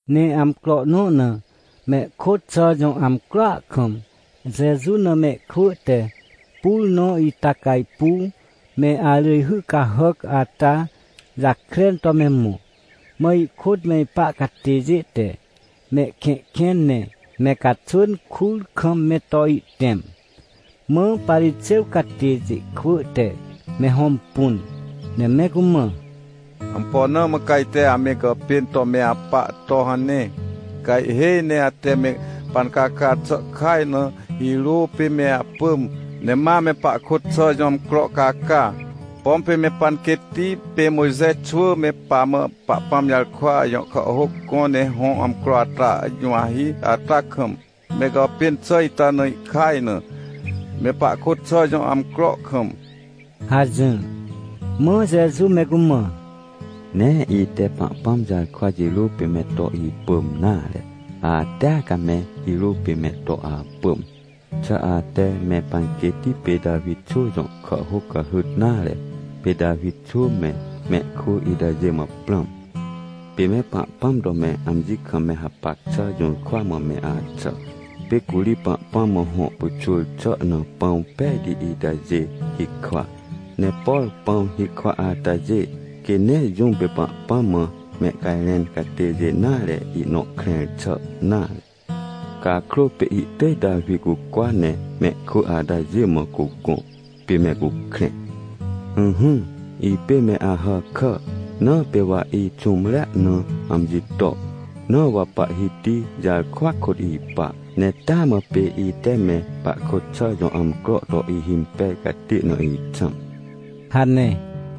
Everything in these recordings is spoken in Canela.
Ne amcro nõ na, mehkôt xà jõ amcroa kam, Jeju na mehkwỳ te pur nõ ita cajpuw me arỳjhy cahàc ata jakren to me mõ. Mã ihkôt me ipa catêjê te mehkẽhkẽn ne me caxwỳn kur kam me to ihtẽm. Mã Parixêw catêjê kwỳ te me hõmpun, ne me cumã: ― Ampo na mã ca ajte ame gàpên to me apa to hane? Ca ihhêj ne ate me pancaca xà kaj na, hirô pê me apỳm, ne ma ame pahkôt xà jõ amcro caca. Pom pê me panquêtti pê Mojxe xwỳ me pamã Pahpãm jarkwa jõ kàhhôc gõ ne hõ amcro ata juwahi ata kam, me gàpên xà ita na ihkaj na, me pahkôt xà jõ amcro kam ― hajỹr. Mã Jeju me cumã: ― Nee ite Pahpãm jarkwa jirô pê me to ipỳm nare. Atea ca me hirô pê me to apỳm. Xà ate me panquêtti pê Tawi xwỳ jõ kàhhôc cahyt nare? Pê Tawi xwỳ me, mehkwỳ itajê mã prãm. Pê me Pahpãm to me amji kam me hapac xà jũrkwa mã me axà. Pê curi Pahpãm mã hõ pyxwỳr xà na pãw pejti itajê hikwa. Ne por pãw hikwa atajê quê nee jũm pê Pahpãm mã mehcajrẽn catêjê nare ihnõ krẽr xà nare. Cakrô pê ihtỳj Tawi cucwa ne mehkwỳ atajê mã cugõ, pê me cukrẽ. ― Ỹhỹ, ipê me Ahàkà, na pê wa ixũmre na amji to. Na wa Pahhiti jarkwa kôt ipa, ne taa mã pê ite me pahkôt xà jõ amcro to ihimpej catê na ixãm ― hane.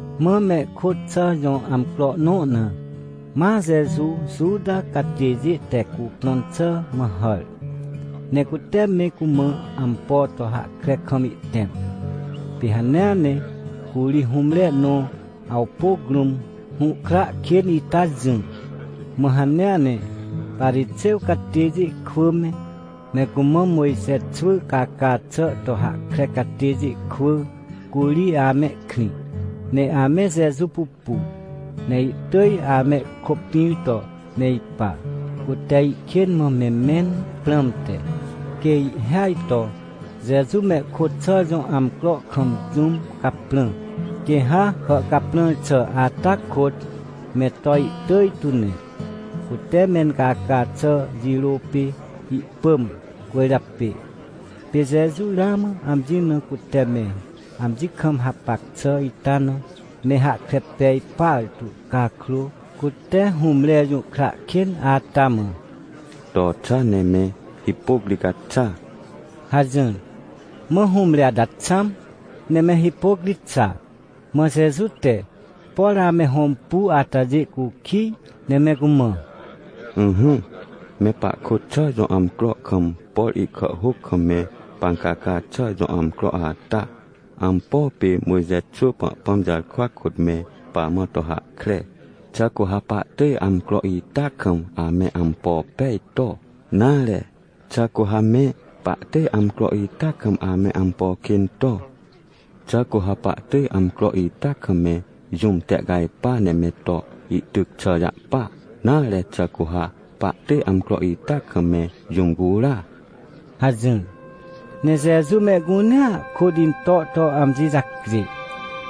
Mã mehkôt xà jõ amcro nõ na, ma Jeju Juta catêjê te cuprõn xà mã hàr, ne cute me cumã ampo to hahkre kam ihtẽm. Pê hanea ne curi hũmre nõ awpôc rũm hũhkra kên ita jỹ. Mã hanea ne Parixêw catêjê kwỳ me, me cumã Mojxe xwỳ caca xà to hahkre catêjê kwỳ curi amehkrĩ, ne ame Jeju pupu, ne ihtỳj amehkôpĩr to me ipa, cute ihkên mã me mẽn prãmte. Quê ihhêaj to Jeju mehkôt xà jõ amcro kam jũm caprã, quê ha hàhcaprãr xà ata kôt me to ihtỳj tu ne, cute mencaca xà jirô pê ihpỳm cwỳrjapê. Pê Jeju ramã amji na cute me amji kam hapac xà ita na me hahkre pej partu cakrô, cute hũmre jũhkra kên ata mã: ― To xa, ne me hipôc ri ca xa ― hajỹr. Mã hũmre ata xãm, ne me hipôc ri xa. Mã Jeju te, por ame hõmpu atajê cukij, ne me cumã: ― Ỹhỹ, me pahkôt xà jõ amcro kam, por ihkàhhôc kam me pancaca xà jõ amcro ata, ampo pê Mojxe xwỳ Pahpãm jarkwa kôt me pamã to hahkre? Xà cu ha pahtỳj amcro ita kam ame ampo pej to? Nare, xà cu ha me pahtỳj amcro ita kam ame ampo kên to? Xà cu ha pahtỳj amcro ita kam me jũm tehcajpa ne me to ihtyc xà jahpa? Nare, xà cu ha pahtỳj amcro ita kam me jũm cura? ― hajỹr. Ne Jeju mehcunea kôt into to amji jacjê,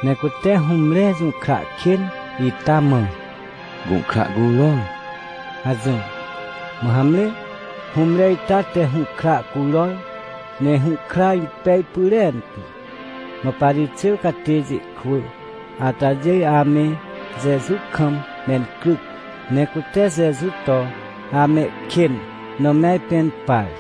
ne cute hũmre jũhkra kên ita mã: ― Gũhkra curor ― hajỹr. Mã hamre, hũmre ita te hũhkra curor, ne hũhkra impej pyrentu. Mã Parixêw catêjê kwỳ atajê ame Jeju kam mencryc, ne cute Jeju to amehkên na me ajpẽn par.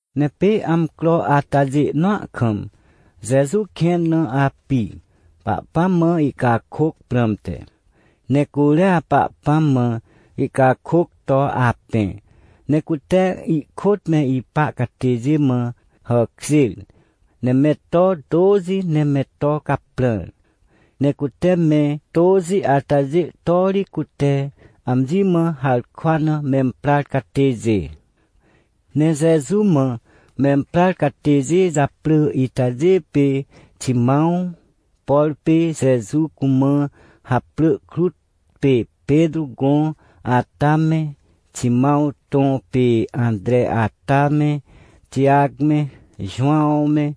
Ne pê amcro atajê nõa kam Jeju kẽn na api, Pahpãm mã ihcakôc prãmte. Ne curia Pahpãm mã ihcakôc to apẽ. Ne cute ihkôt me ipa catêjê mã hàkjêr, ne me to tôxi ne me to caprãr. Ne cute me tôxi atajê to ri cute amji mã harkwa na memprar catêjê. Ne Jeju mã memprar catêjê japrỳ itajê pê Ximãw, por pê Jeju cumã haprỳ krut pê Petrô gõ ata me, Ximãw tõ pê Antre ata me, Tijac me, Jowãw me,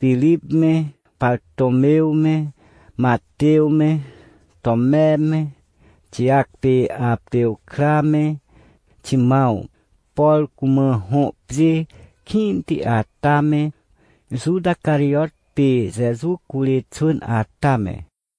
Pirip me, Partômew me, Matew me, Tome me, Tijac pê Arpew kra me, Ximãw, por cumã hõ pjê kĩnti ata me, Juta pê Tijac kra me, Juta Carijot pê Jeju curê xwỳn ata me.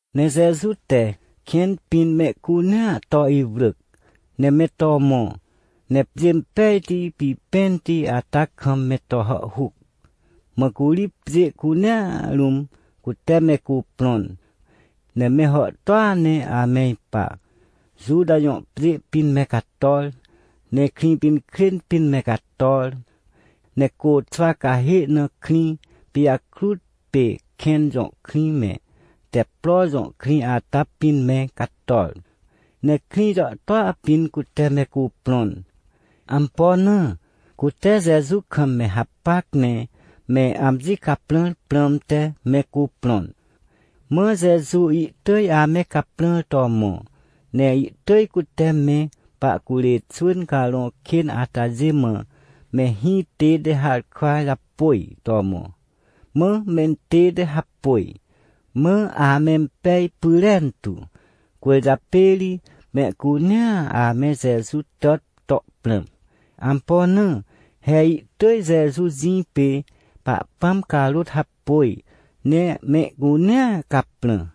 Ne Jeju te kẽn pĩn mehcunea to iwrỳc, ne me to mõ, ne pjê impejti pipẽnti ata kam me to hàhhuc. Mã curi pjê cunea rũm cute me cuprõn, ne me hàhtôa ne ame ipa. Juta jõ pjê pĩn me cator, ne Krĩpinkrên pĩn me cator. Ne côxwa cahê na krĩ pijakrut pê Kẽn jõ krĩ me, Teppro jõ krĩ ata pĩn me cator. Ne krĩ jàhtôa pĩn cute me cuprõn. Ampo na? Cute Jeju kam me hapac ne me amji caprãr prãmte me cuprõn. Mã Jeju ihtỳj ame caprãr to mõ. Ne ihtỳj cute me pahcurê xwỳn carõ kên atajê mã, me hĩ tête harkwa japôj to mõ. Mã mentête hapôj, mã amempej pyrentu. Cwỳrjapê ri mehcunea ame Jeju tàt to prãm. Ampo na? He ihtỳj Jeju jĩ pê Pahpãm carôt hapôj, ne mehcunea caprã.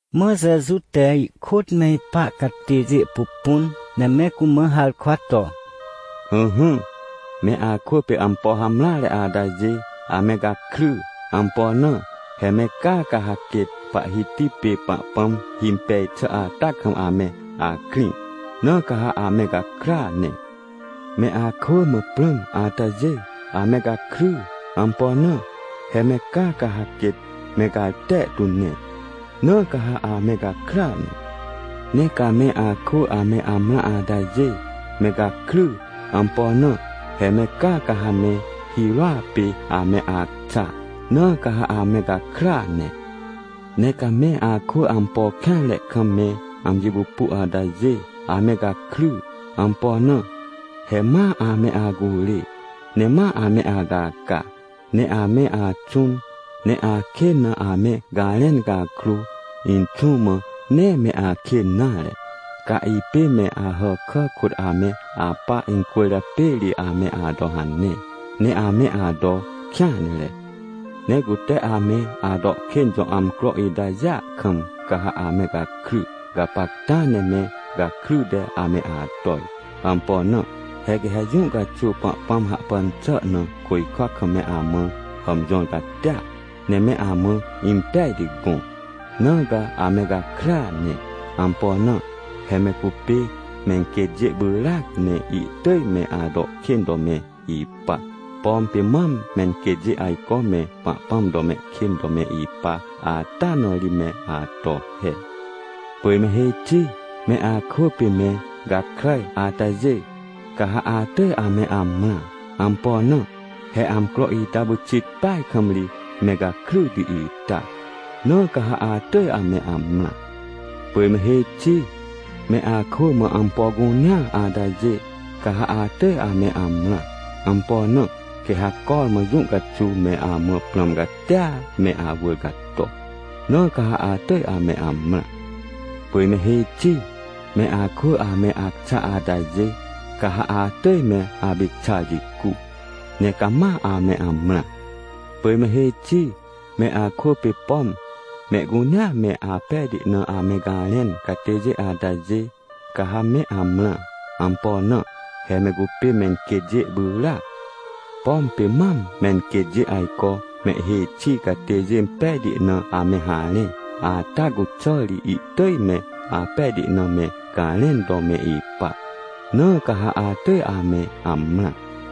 Mã Jeju te ihkôt me ipa catêjê pupun, ne me cumã harkwa to: ― Ỹhỹ, me akwỳ pê ampo hamreare atajê, ame gakry! Ampo na? He me caa, ca ha quêt Pahhiti pê Pahpãm himpej xà ata kam ame akrĩ, na ca ha ame gakrya ne! ― Me akwỳ mã prãm atajê, ame gakry! Ampo na? He me caa, ca ha quêt me garte tu ne, na ca ha ame gakrya ne. Ne ca me akwỳ ame amrã atajê, me gakry! Ampo na? He me caa, ca ha me hirôa pê ame acxa, na ca ha ame gakrya ne. ― Ne ca me akwỳ ampo kêanre kam me amji pupu atajê, ame gakry! Ampo na? He ma ame acurê, ne ma ame acaca, ne ame axũn, ne akên na ame garẽn cakrô, Inxũ mã nee me akên nare. Ca ipê me Ahàkà kôt ame apa, ita cwỳrjapê ri ame ato hane, ne ame ato kêanre. Ne cute ame ato kên jõ amcro itajêa kam, ca ha ame gakry! Gapacta ne me gakryte ame atoj. Ampo na? He quê ha jũ caxuw Pahpãm hahpan xà na, côjkwa kam me amã hàmjõr catia, ne me amã impejti gõ. Na ca ame gakrya ne! Ampo na? He me cupê menquêtjê pyràac, ne ihtỳj me ato kên to me ipa, pom pê mam menquêtjê ajco me Pahpãm to mehkên to me ipa ata na ri me ato he. ― Pỳj me hêj xi, me akwỳ pê me gakràj atajê, ca ha atỳj ame amrã! Ampo na? He amcro ita pyxit peaj kam ri me gakryti ita. Na ca ha atỳj ame amrã! ― Pỳj me hêj xi, me akwỳ mã ampo cunea atajê, ca ha atỳj ame amrã! Ampo na? Quê ha cormã jũ caxuw me amã prãm catia me awỳr cato, na ca ha atỳj ame amrã! ― Pỳj me hêj xi, me akwỳ ame acxa atajê, ca ha atỳj me apicxar jicu ne cama ame amrã! ― Pỳj me hêj xi, me akwỳ pê, pom mehcunea me apejti na ame garẽn catêjê atajê, ca ha me amrã! Ampo na? He me cupê menquêtjê pyràac. Pom pê mam menquêtjê ajco mehhêj xi catêjê pejti na ame harẽ, ata cuxà ri ihtỳj me apejti na me garẽn to me ipa. Na ca ha atỳj ame amrã!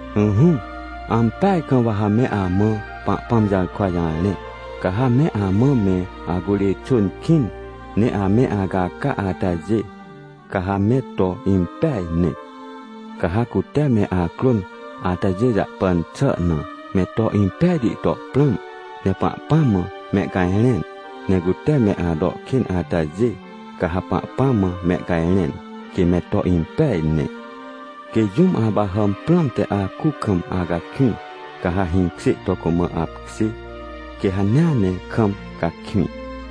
― Ỹhỹ, ampeaj kam wa ha me amã Pahpãm jarkwa jarẽ. Ca ha me amã me acurê xwỳn kĩn. Ne ame acaca atajê, ca ha me to impeaj ne. ― Ca ha cute me acrôn atajê jahpan xà na, me to impejti to prãm, ne Pahpãm mã mehcajrẽn. Ne cute me ato kên atajê, ca ha Pahpãm mã mehcajrẽn, quê me to impeaj ne. ― Quê jũm apahàm prãmte akuc kam acakwĩ, ca ha hĩkjê to cumã apkjê, quê hanea ne kam cakwĩ.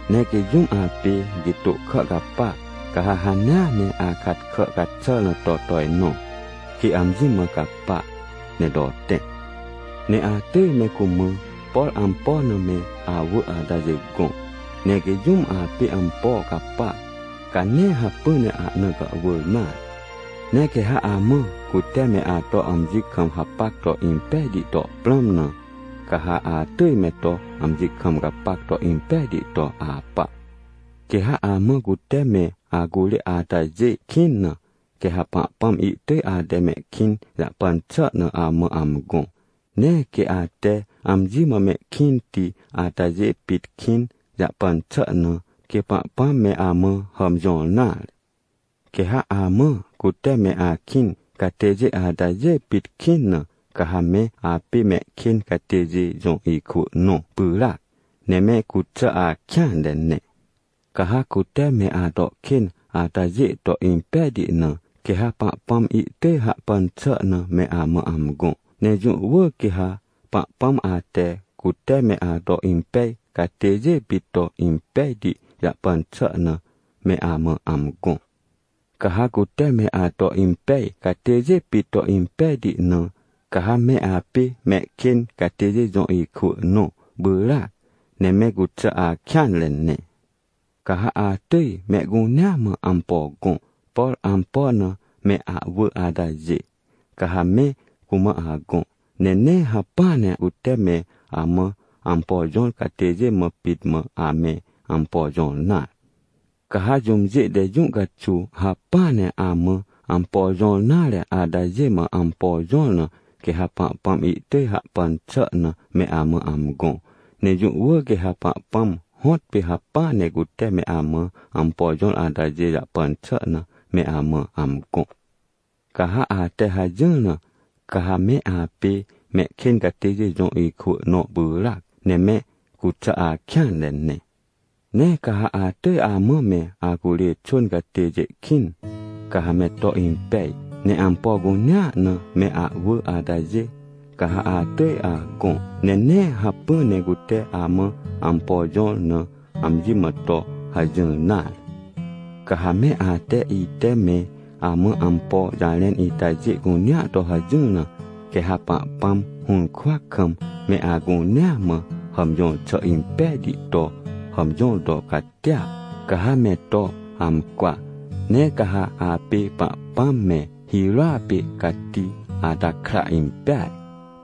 Ne quê jũm apê gitô kà capa, ca ha hanea ne akat kà caxàr na to tojnõ, quê amji mã capa ne to tẽ. ― Ne atỳj me cumã, por ampo na me awỳ atajê gõ. Ne quê jũm apê ampo capa, ca nee hacpỹ ne ahna gàhwỳr nare. ― Ne quê ha amã cute me ato amji kam hapac to impejti to prãm na, ca ha atỳj me to amji kam gapac to impejti to apa. ― Quê ha amã cute me acurê atajê kĩn na, quê ha Pahpãm ihtỳj ate mehkĩn jahpan xà na amã amgõ. Nee quê ate amji mã mehkĩnti atajê pit kĩn jahpan xà na, quê Pahpãm me amã hàmjõr nare. Quê ha amã cute me akĩn catêjê atajê pit kĩn na, ca ha me apê mehkên catêjê jõ ikwỳ nõ pyràac, ne me cuxà akêanre ne. ― Ca ha cute me ato kên atajê to impejti na, quê ha Pahpãm ihtỳj hahpan xà na me amã amgõ. Ne jũ wỳr quê ha Pahpãm ate, cute me ato impej catêjê pit to impejti jahpan xà na, me amã amgõ. Ca ha cute me ato impej catêjê pit to impejti na, ca ha me apê mehkên catêjê jõ ikwỳ nõ pyràac, ne me cuxà akêanre ne. ― Ca ha atỳj mehcunea mã ampo gõ, por ampo na me ahwỳ atajê, ca ha me cumã agõ. Ne nee hacpỹa ne cute me amã ampo jõr catêjê mã pit mã ame ampo jõr nare. Ca ha jũmjê te jũ caxuw hacpỹa ne amã ampo jõr nare atajê mã ampo jõr na, quê ha Pahpãm ihtỳj hahpan xà na me amã amgõ. Ne jũ wỳr quê ha Pahpãm hõtpê hacpỹa ne cute me amã ampo jõr atajê jahpan xà na me amã amgõ. Ca ha ate hajỹr na, ca ha me apê mehkên catêjê jõ ikwỳ nõ pyràac, ne me cuxà akêanre ne. ― Ne ca ha atỳj amã me acurê xwỳn catêjê kĩn, ca ha me to impej. Ne ampo cunea na me ahwỳ atajê, ca ha atỳj agõ, ne nee hacpỹa ne cute amã ampo jõr na amji mã to hajỹr nare. Ca ha me ate ite me amã ampo jarẽn itajê cunea to hajỹr na, quê ha Pahpãm hũrkwa kam, me acunea mã hàmjõr xà impejti to hàmjõr to catia, ca ha me to amcwa, ne ca ha apê Pahpãm me hirôa pê cati ata kra impeaj.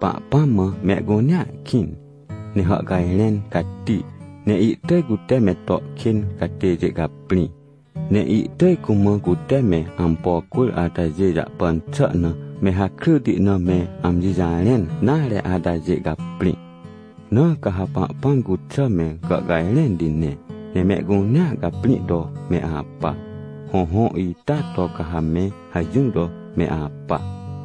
Pahpãm mã mehcunea kĩn, ne hàhcajrẽn cati, ne ihtỳj cute me to kên catêjê caprĩ, ne ihtỳj cumã cute me ampo cwỳr atajê jahpan xà na me hakryti na me amji jarẽn nare atajê caprĩ. ― Na ca ha Pahpãm cuxà me gàhcajrẽnti ne, ne mehcunea caprĩ to me apa. Hõhõ, ita to ca ha me hajỹr to me apa.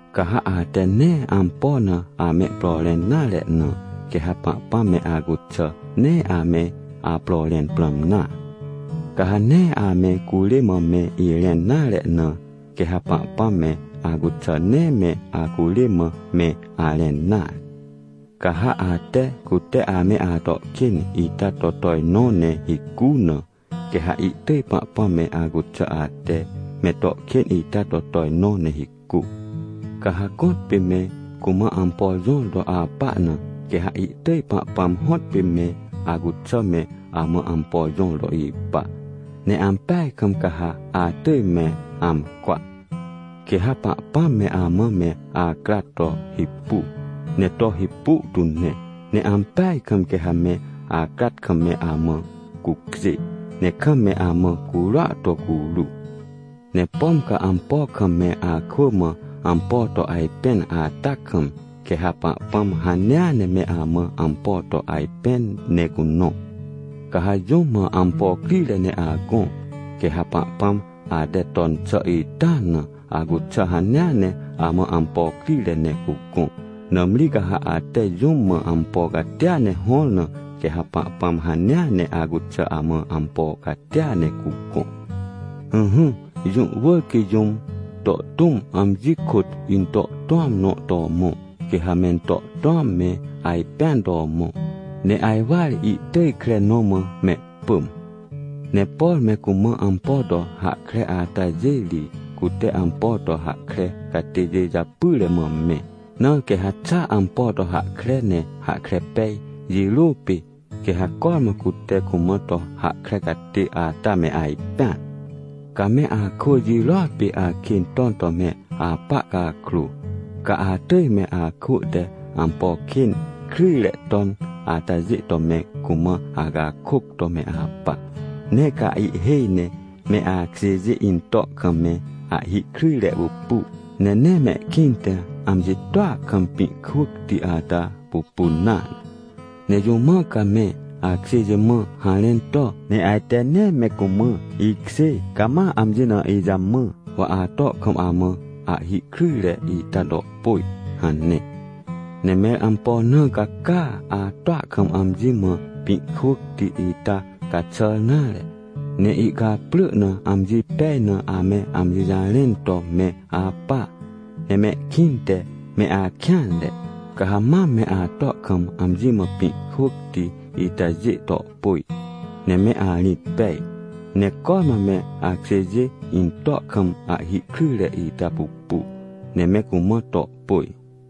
― Ca ha ate nee ampo na amehpro rẽn nare na, quê ha Pahpãm me acuxà nee ame apro rẽn prãm nare. Ca ha nee ame curê mã me irẽn nare na, quê ha Pahpãm me acuxà nee me acurê mã me arẽn nare. Ca ha ate cute ame ato kên ita to tojnõ ne hicu na, quê ha ihtỳj Pahpãm me acuxà, ate me to kên ita to tojnõ ne hicu. ― Ca ha gõtpê me cumã ampo jõr to apa na, quê ha ihtỳj Pahpãm hõtpê me acuxà me amã ampo jõr to ipa. Ne ampeaj kam ca ha atỳj me amcwa. Quê ha Pahpãm me amã me acrat to hipu, ne to hipu tu ne, ne ampeaj kam quê ha me acrat kam me amã cucjê, ne kam me amã curua to curu. Ne pom ca ampo kam me akwỳ mã ampo to ajpẽn ata kam, quê ha Pahpãm hanea ne me amã ampo to ajpẽn ne cunõ. Ca ha jũm mã ampo crire ne agõ, quê ha Pahpãm ate ton xà ita na, acuxà hanea ne amã ampo crire ne cugõ. Nãmri ca ha ate jũm mã ampo catia ne hõr na, quê ha Pahpãm hanea ne acuxà amã ampo catia ne cugõ. ― Ỹhỹ, jũ wỳr quê jũm to tũm, amji kôt into tũam nõ to mõ. Quê ha mento tũam me ajpẽn to mõ, ne ajwar ihtỳj kre nõ mã mehpỳm. ― Ne por me cumã ampo to hahkre atajê ri cute ampo to hahkre catêjê japyre mã me. Na quê ha xa ampo to hahkre ne hahkre pej jirô pê, quê ha cormã cute cumã to hahkre catê ata me ajpẽan. ― Ca me akwỳ jirôa pê akên ton to me apa cakrô, ca atỳj me akwỳ te ampo kên kryjre ton atajê to me cumã acakôc to me apa. Ne ca ihhêj ne me akjêjê into kam me ahhi kryjre pupu, ne nee mehkĩnte amji toa kam pĩ kwỳcti ata pupun nare. Ne jũ mã ca me akjêjê mã harẽn to, ne ajte ne me cumã: “Ikjê, cama amji na ijamã, wa ato kam amã ahhi kryjre ita to pôj” hane. Ne mẽr ampo na ca caa, atoa kam amji mã pĩ kwỳcti ita caxàr nare? Ne ihcaprỳ na amji pej na ame amji jarẽn to me apa, ne mehkĩnte me akêanre. Ca ha mam me ato kam amji mã pĩ kwỳcti itajê to pôj, ne me arĩt pej, ne cormã me akjêjê into kam ahhi kryjre ita pupu, ne me cumã to pôj.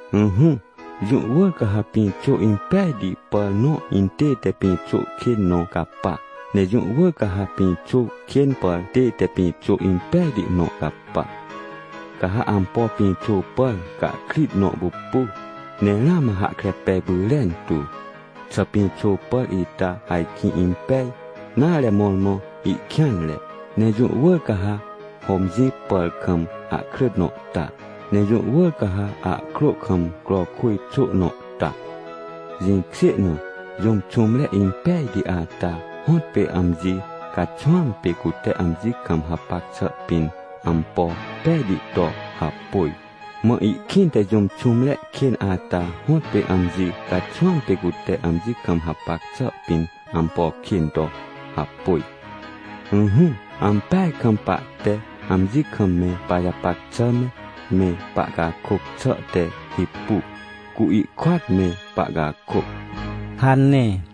― Ỹhỹ, jũ wỳr ca ha pĩxô impejti pàr nõ intête, pĩxô kên nõ capa, ne jũ wỳr ca ha pĩxô kên pàr tête, pĩxô impejti nõ capa. Ca ha ampo pĩxô pàr cahkrit nõ pupu, ne ramã hahkre pej pyrentu, xà pĩxô pàr ita ajkĩ impej, nare, mõrmõ ihkêanre. Ne jũ wỳr ca ha hômjĩ pàr kam ahkrỳt nõ ta, ne jũ wỳr ca ha ahkrô kam crowkwỳj xô nõ ta. Jĩkjê na, jũm xũmre impejti ata hõtpê amji caxwãm pê cute amji kam hapac xà pĩn ampo pejti to hapôj, mã ihkĩnte jũm xũmre kên ata hõtpê amji caxwãm pê cute amji kam hapac xà pĩn ampo kên to hapôj. Ỹhỹ, ampeaj kam pahte amji kam me pajapac xà me, me pahcakôc xà te hipu, cu ihkôat me pahcakôc ― hane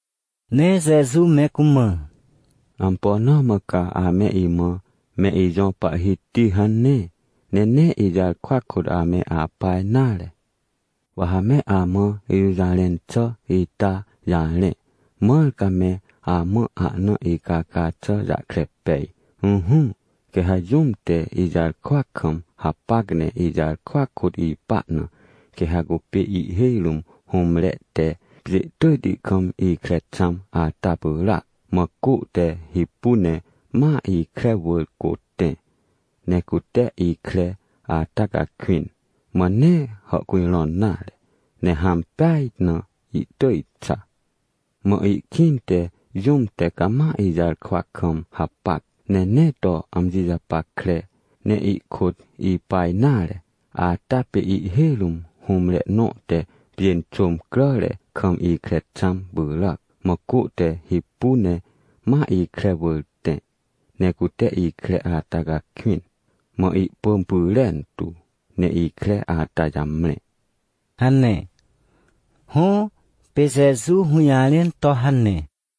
Ne Jeju me cumã: ― Ampo na mã ca ame imã: “Me ijõ Pahhiti” hane, ne nee ijarkwa kôt ame apa nare? Wa ha me amã ijũjarẽn xà ita jarẽ, mãr ca me amã ahna icaca xà jahkre pej. Ỹhỹ, quê ha jũm te ijarkwa kam hapac ne ijarkwa kôt ipa na, quê ha cupê ihhêj rũm hũmre te pjê tỳjti kam ikre xãm ata pyràac. Mã cô te hipu, ne ma ikre wỳr cô tẽ, ne cute ikre ata cakwĩn, mã nee hàhcujrõn nare, ne hãm peaj na ihtỳj xa. Mã ihkĩnte jũm te cama ijarkwa kam hapac, ne nee to amji japackre, ne ihkôt ipa nare, ata pê ihhêj rũm hũmre nõ te pjênxôm cràre kam ikre xãm pyràac. Mã cô te hipu ne ma ikre wỳr tẽ, ne cute ikre ata cakwĩn, mã ihpỳm pyrentu, ne ikre ata jamre ― hane. Hõ, pê Jeju hũjarẽn to hane.